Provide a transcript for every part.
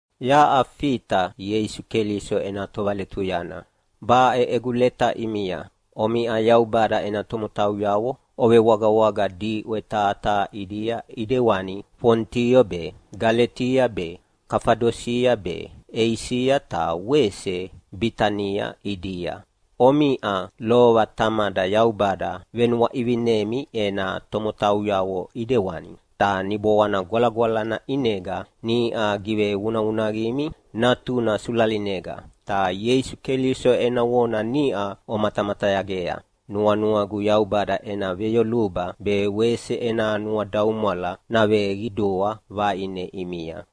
Yaʼa Fita Ieisu Keliso ena tovaletuyana. Baʼe egu leta ʼimia, omiʼa Yaubada ena tomotauyavo ovewagawaga diʼwe taha taha ʼidia ʼidewani Fonito be, Galetia be, Kafadosia be, Eisia ta wese Bitania ʼidia. Omiʼa lova Tamada Yaubada venuaʼivinemi ena tomotauyavo ʼidewani, ta Niboana Gwalagwalana ʼinega niʼa givevunavunaqimi Natuna sulalinega, ta Ieisu Keliso ena vona niʼa omatamatayagea. Nuanuagu Yaubada ena veyoluba be wese ena nuadaumwala naveqidua vaʼine ʼimia.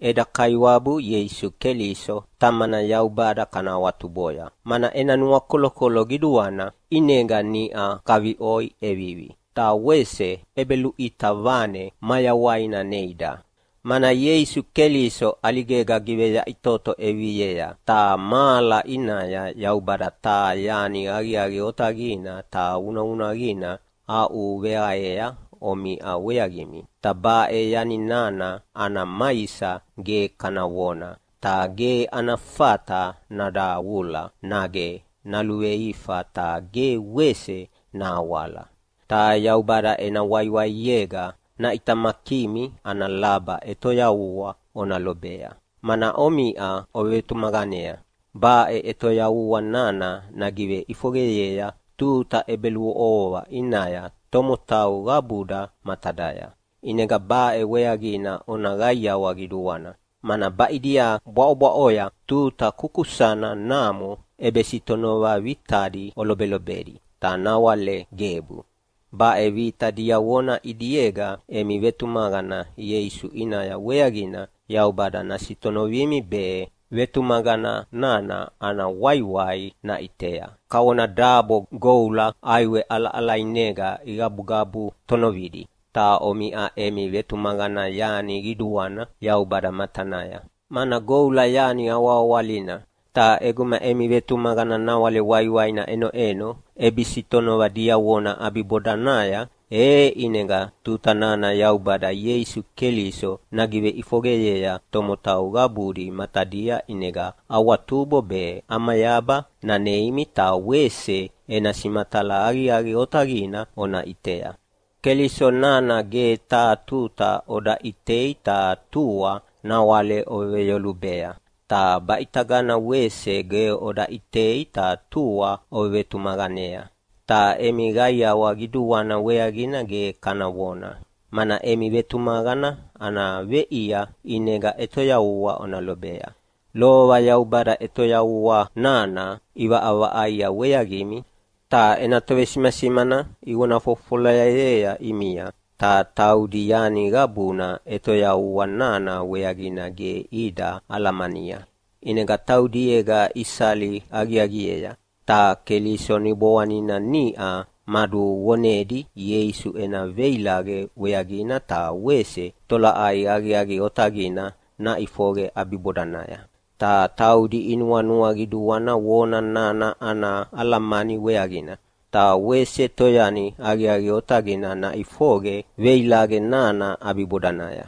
Eda Kaiwabu Ieisu Keliso Tamana Yaubada kana awatuboya, mana ena nuakolokolo qiduana ʼinega niʼa kaviʼoi ʼevivi, ta wese ʼebeluʼita vane mayawaina neida, mana Ieisu Keliso ʼaligega giveyaʼitoto ʼeviviea. Ta mahala ʼinaya Yaubada taha yani aqiaqi otaqina ta vunavunaqina aʼuveaqea omiʼa weaqimi, ta baʼe yani nana ana maisa ge kana vona, ta ge ana fata nadavula nage naluveifa ta ge wese nahawala. Ta Yaubada ena waiwaiega naʼitamakimi ana laba ʼetoyavua ona lobea, mana omiʼa ovevetumaqanea. Baʼe ʼetoyavua nana nagiveʼifoqeyea tuta ʼebeluʼovoa ʼinaya tomotau qabuda matadaya. ʼInega baʼe weaqina ona qaiawa qiduana, mana baʼidia bwaʼobwaʼoya tuta kukusana namo ʼebesitonova vitadi olobelobedi, ta nawale gebu. Baʼe vita diavona ʼidiega emi vetumaqana Ieisu ʼinaya weaqina Yaubada nasitonovimi be vetumaqana nana ana waiwai naʼitea, kavona dabo goula ʼaiwe ʼalaʼalainega igabugabu tonovidi. Ta omiʼa emi vetumaqana yani qiduana Yaubada matanaya, mana goula yani awahawalina. Ta ʼeguma emi vetumaqana nawale waiwaina ʼenoʼeno ʼebesitonova diavona ʼabibodanaya, e ʼinega tuta nana Yaubada Ieisu Keliso nagiveʼifoqeyea tomotau qabudi matadia ʼinega awatubo be ʼamayaba naneimi ta wese ena simatala aqiaqi otaqina ona ʼitea. Keliso nana ge taha tuta oda ʼitei ta tua nawale oveveyolubea, ta baʼitagana wese ge oda ʼitei ta tua ovevetumaqanea. Ta emi qaiawa qiduana weaqina ge kana vona, mana emi vetumaqana ana veʼia ʼinega ʼetoyavua ona lobea. Lova Yaubada ʼetoyavua nana ʼivaʼavaʼaia weaqimi, ta ena tovesimasimana ivona fofofolayea ʼimia. Ta taudi yani qabuna ʼetoyavua nana weaqina ge ida alamania, ʼinega taudiega isali aqiaqiea. Ta Keliso Niboanina niʼa maduvonedi Ieisu ena veilaqe weaqina ta wese tolaʼai aqiaqi otaqina naʼifoqe ʼabibodanaya. Ta taudi inuanua qiduana vona nana ana alamani weaqina, ta wese toyani aqiaqi otaqina naʼifoqe veilaqe nana ʼabibodanaya.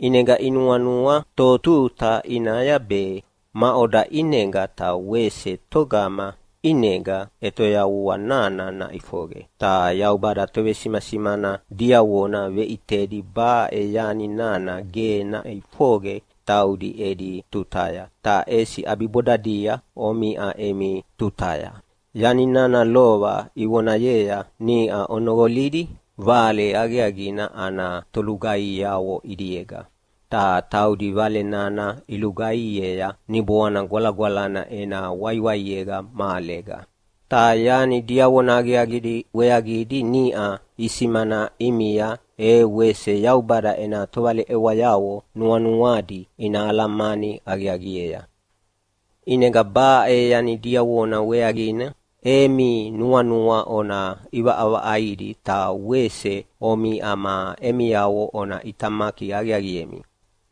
ʼInega inuanua totuta ʼinaya be, maʼoda ʼinega ta wese togama ʼinega ʼetoyavua nana naʼifoqe. Ta Yaubada tovesimasimana diavona veʼitedi baʼe yani nana ge naʼifoqe taudi edi tutaya, ta ʼesi ʼabibodadia omiʼa emi tutaya. Yani nana lova ivonayea niʼa onoqolidi Vale Aqiaqina ana tolugaihiavo ʼidiega. Ta taudi Vale nana ilugaihiea Niboana Gwalagwalana ena waiwaiega mahalega. Ta yani diavona aqiaqidi weaqidi niʼa isimana ʼimia e wese Yaubada ena tovaleʼewayavo nuanuadi ina alamani aqiaqiea. ʼInega baʼe yani diavona weaqina emi nuanua ona ʼivaʼavaʼaidi ta wese omiʼa ma emiavo ona ʼitamaki aqiaqiemi.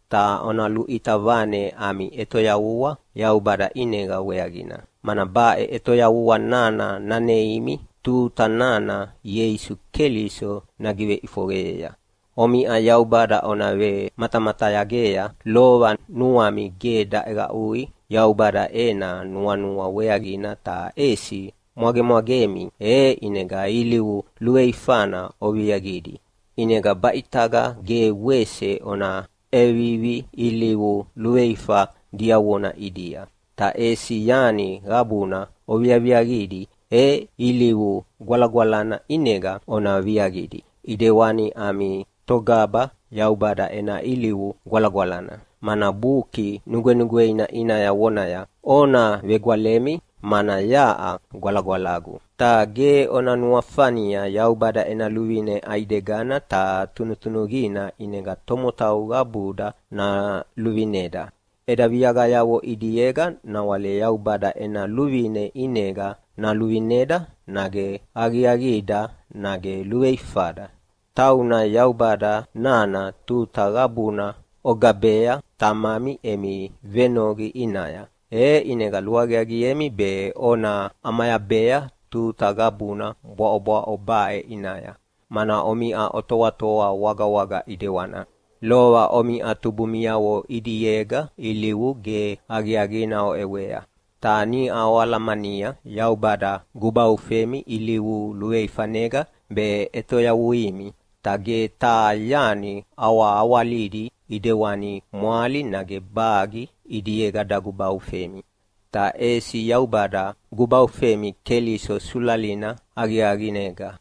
Ta ona luʼita vane ami ʼetoyavua Yaubada ʼinega weaqina, mana baʼe ʼetoyavua nana naneimi tuta nana Ieisu Keliso nagiveʼifoqeyea. Omiʼa Yaubada ona vematamatayagea. Lova nuami ge daʼeqaʼui Yaubada ena nuanua weaqina ta ʼesi mwagemwagemi, e ʼinega ilivu luveifana oviaqidi. ʼInegana baʼitaga ge wese ona ʼevivi ilivu luveifa diavona ʼidia. Ta ʼesi yani qabuna oviaviaqidi, e ilivu gwalagwalana ʼinega ona viaqidi, ʼidewani ami Togaba Yaubada ena ilivu gwalagwalana. Mana Buki Nugwenugweina ʼinaya vonaya, “Ona vegwalemi mana yaʼa gwalagwalagu.” Ta ge ona nuafania Yaubada ena luvine ʼaidegana ta tunutunuqina ʼinega tomotau qabuda naluvineda. Eda viaqayavo ʼidiega nawale Yaubada ena luvine ʼinega naluvineda nage aqiaqida nage luveifada. Tauna Yaubada nana tuta qabuna ogabea Tamami emi venoqi ʼinaya, e ʼinega luaqiaqiemi be ona ʼamayabea tuta qabuna bwaʼobwaʼo baʼe ʼinaya, mana omiʼa otoatoa wagawaga ʼidewana. Lova omiʼa tubumiavo ʼidiega ilivu ge aqiaqina oʼewea. Ta niʼa oalamania Yaubada gubaufemi ilivu luveifanega be ʼetoyavuimi. Ta ge taha yani awahawalidi ʼidewani mwali nage bagi ʼidiega dagubaufemi. Ta ʼesi Yaubada gubaufemi Keliso sulalina aqiaqinega.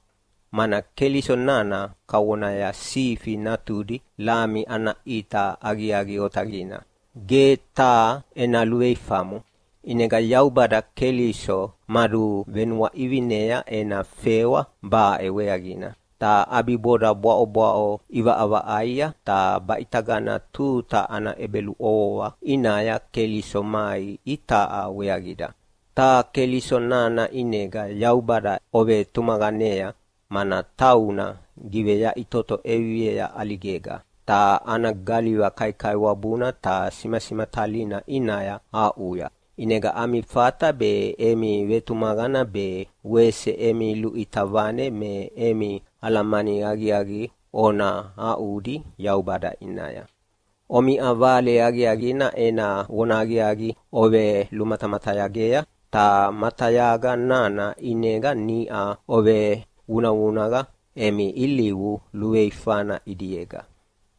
Mana Keliso nana kavonaya sifi natudi lami ana ʼita aqiaqi otaqina, ge taha ena luveifamo. ʼInega Yaubada Keliso maduvenuaʼivinea ena fewa baʼe weaqina, ta ʼabiboda bwaʼobwaʼo ʼivaʼavaʼaia. Ta baʼitagana tuta ana ʼebeluʼovoa ʼinaya Keliso mai itaʼa weaqida. Ta Keliso nana ʼinega Yaubada ovetumaqanea, mana tauna giveyaʼitoto ʼeviviea ʼaligega, ta ana galiva kaikaiwabuna ta simasimatalina ʼinaya aʼuya. ʼInega ami fata be emi vetumaqana be wese emi luʼita vane me emi alamani aqiaqi ona aʼudi Yaubada ʼinaya. Omiʼa Vale Aqiaqina ena vonahaqiaqi ovelumatamatayagea, ta matayaga nana ʼinega niʼa ovevunavunaqa emi ilivu luveifana ʼidiega,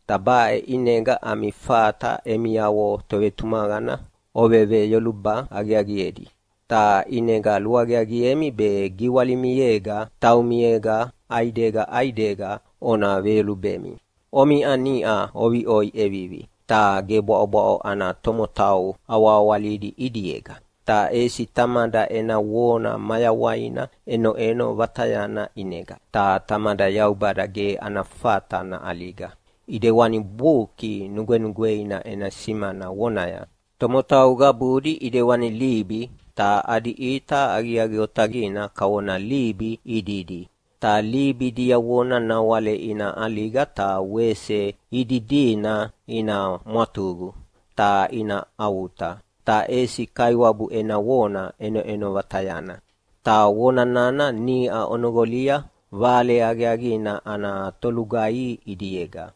ta baʼe ʼinega ami fata emiavo tovetumaqana oveveyoluba aqiaqiedi. Ta ʼinega luaqiaqiemi be giwalimiega taumiega ʼaidega ʼaidega ona veyolubemi. Omiʼa niʼa oviʼoi ʼevivi, ta ge bwaʼobwaʼo ana tomotau awahawalidi ʼidiega, ta ʼesi Tamada ena vona mayawaina ʼenoʼeno vatayana ʼinega. Ta Tamada Yaubada ge ana fata naʼaliga. ʼIdewani Buki Nugwenugweina ena simana vonaya, “Tomotau qabudi ʼidewani libi, ta adi ʼita aqiaqi otaqina kavona libi ididi. Ta libi diavona nawale ina ʼaliga ta wese ididina ina mwatuqu ta ina avuta. Ta ʼesi Kaiwabu ena vona ʼenoʼeno vatayana.” Ta Vona nana niʼa onoqolia Vale Aqiaqina ana tolugaihi ʼidiega.